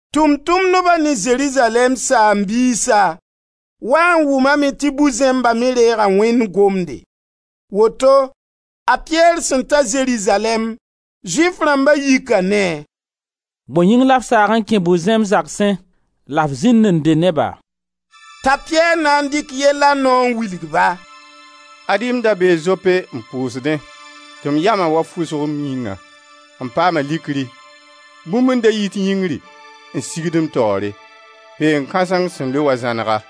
Tʋʋm-tʋmdba ne Zerizalɛɛm saam-biisa waa n wʋmame tɩ bu-zẽmba me reega Wẽnd gomde. Woto a Piyɛr sẽn ta Zerizalɛɛm, Zʋɩf rãmba yika ne-a: «Bõe yĩng la f saag n kẽ bu-zẽmb zagsẽ la f zĩnd n dɩ ne-ba?» T'a Piyɛr na n dɩk yella nao n wilg-ba: «Ad-y m da bee Zope n pʋʋsdẽ, tɩ m yama wa fʋsg m yĩngã; m paama likri. Bũmb n da yit yĩngri sigd m taoore: peen kãseng sẽn loe wa zãnega.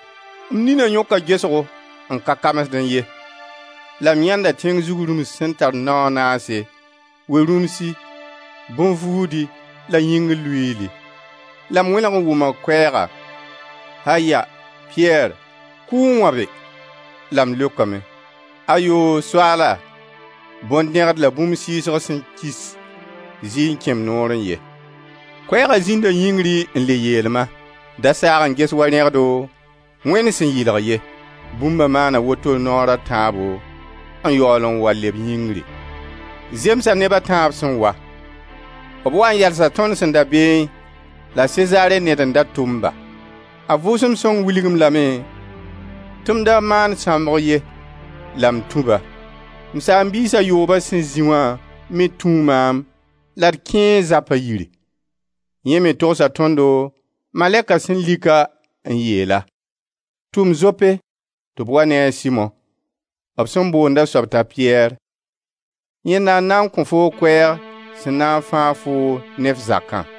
M nina yõka gesgo n ka kamsdẽ ye la m yãenda tẽng zug rũms sẽn tar nao a naase, we-rũmsi, bõn-vuudi la yĩngr luiili. La m wẽneg n wʋma koɛɛga: ‹Aya! Piyɛr, kʋ n wãbe.› La m leokame: ‹Ayo! Soaala, bõn dẽgd la bũmb sɩɩsg sẽn kis zɩɩ n kẽ m noorẽ ye.› Koɛɛga zĩnda yĩngri n le yeel-ma: ‹Da saag n ges wa rẽgdo Wẽnd sẽn yɩlg ye.› Bũmba maana woto naoor a tãabo n yaool n wa leb yĩngri. Zemsa neb a tãab sẽn wa. B waa n yalsa tõnd sẽn da beẽ la Sezare ned n da tʋm-ba. A Vʋʋsem Sõng wilg-m lame tɩ m da maan sãmbg ye la m tũ-ba. M saam-biis a yoobã sẽn zĩ wã me tũu maam la d kẽe zapa yiri. Yẽ me togsa tõndo malɛka sẽn lik-a n yeel-a: ‹Tʋm Zope tɩ b wa ne a Simo, b sẽn boonda soab t'a Piyɛr. Yẽnda n na n kõ foo koɛɛg sẽn na n fãag foo ne f zakã.›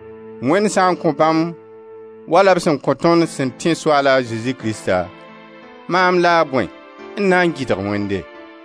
Wẽnd sã n kõ bãmb wala b sẽn kõ tõnd sẽn tẽ Soaal a Zezi Krista, maam la a bõe n na n gɩdg Wẽnde.»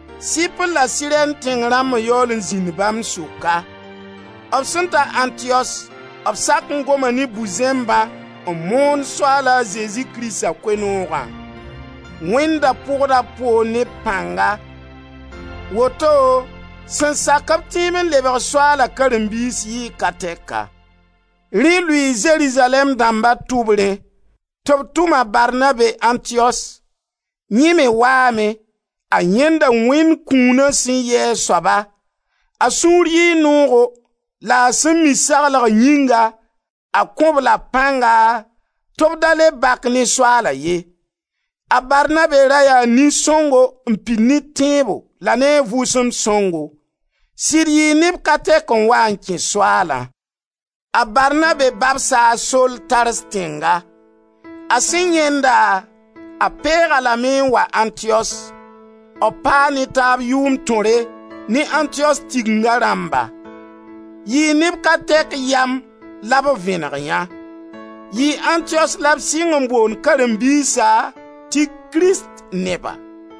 Sɩpr la Sirɛn tẽng rãmb n yaool n zĩnd bãmb sʋka. B sẽn ta Antiyos b sak n goma ne bu-zẽmbã n moon Soaal a Zezi Krista Koe-noogã. Wẽnd da pʋgda b poor ne b pãnga. Woto sẽn sak-b tẽeb n lebg Soaala karen-biis yɩɩ ka tɛka. Rẽ lʋɩɩ Zerizalɛɛm dãmba tʋbrẽ tɩ b tʋm a Barnabe Antiyos. Yẽ me waame; a yãenda Wẽnd kũuna sẽn yɩ a soaba; a sũur yɩɩ noogo la a sẽn mi saglg yĩnga a kõ-b-la pãnga tɩ b da le bak ne Soaala ye. A Barnabe ra yaa nin-sõngo n pid ne tẽebo la ne a Vʋʋsem Sõngo. Sɩd yɩɩ neb ka tɛk n wa n kẽ Soaalã. A Barnabe babsa a Sol Tars tẽnga. A sẽn yãend-a, a peeg-a lame n wa Antiyos. B paa ne taab yʋʋmd tõre ne Antiyos Tigenga rãmba. Yɩɩ neb ka tɛk yam la b vẽneg yã. Yɩɩ Antiyos la b sɩng n boond karen-biisa tɩ «kristneba».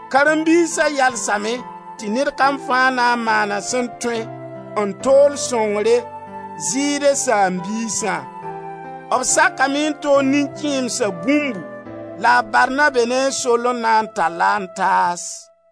Karen-biisa yalsame tɩ ned kam fãa na n maana a sẽn tõe n tool sõngre Zɩɩde saam-biisã. B sakame n tool nin-kẽemsa bũmbu la a Barnabe ne a Sol n na n tall-a n taas.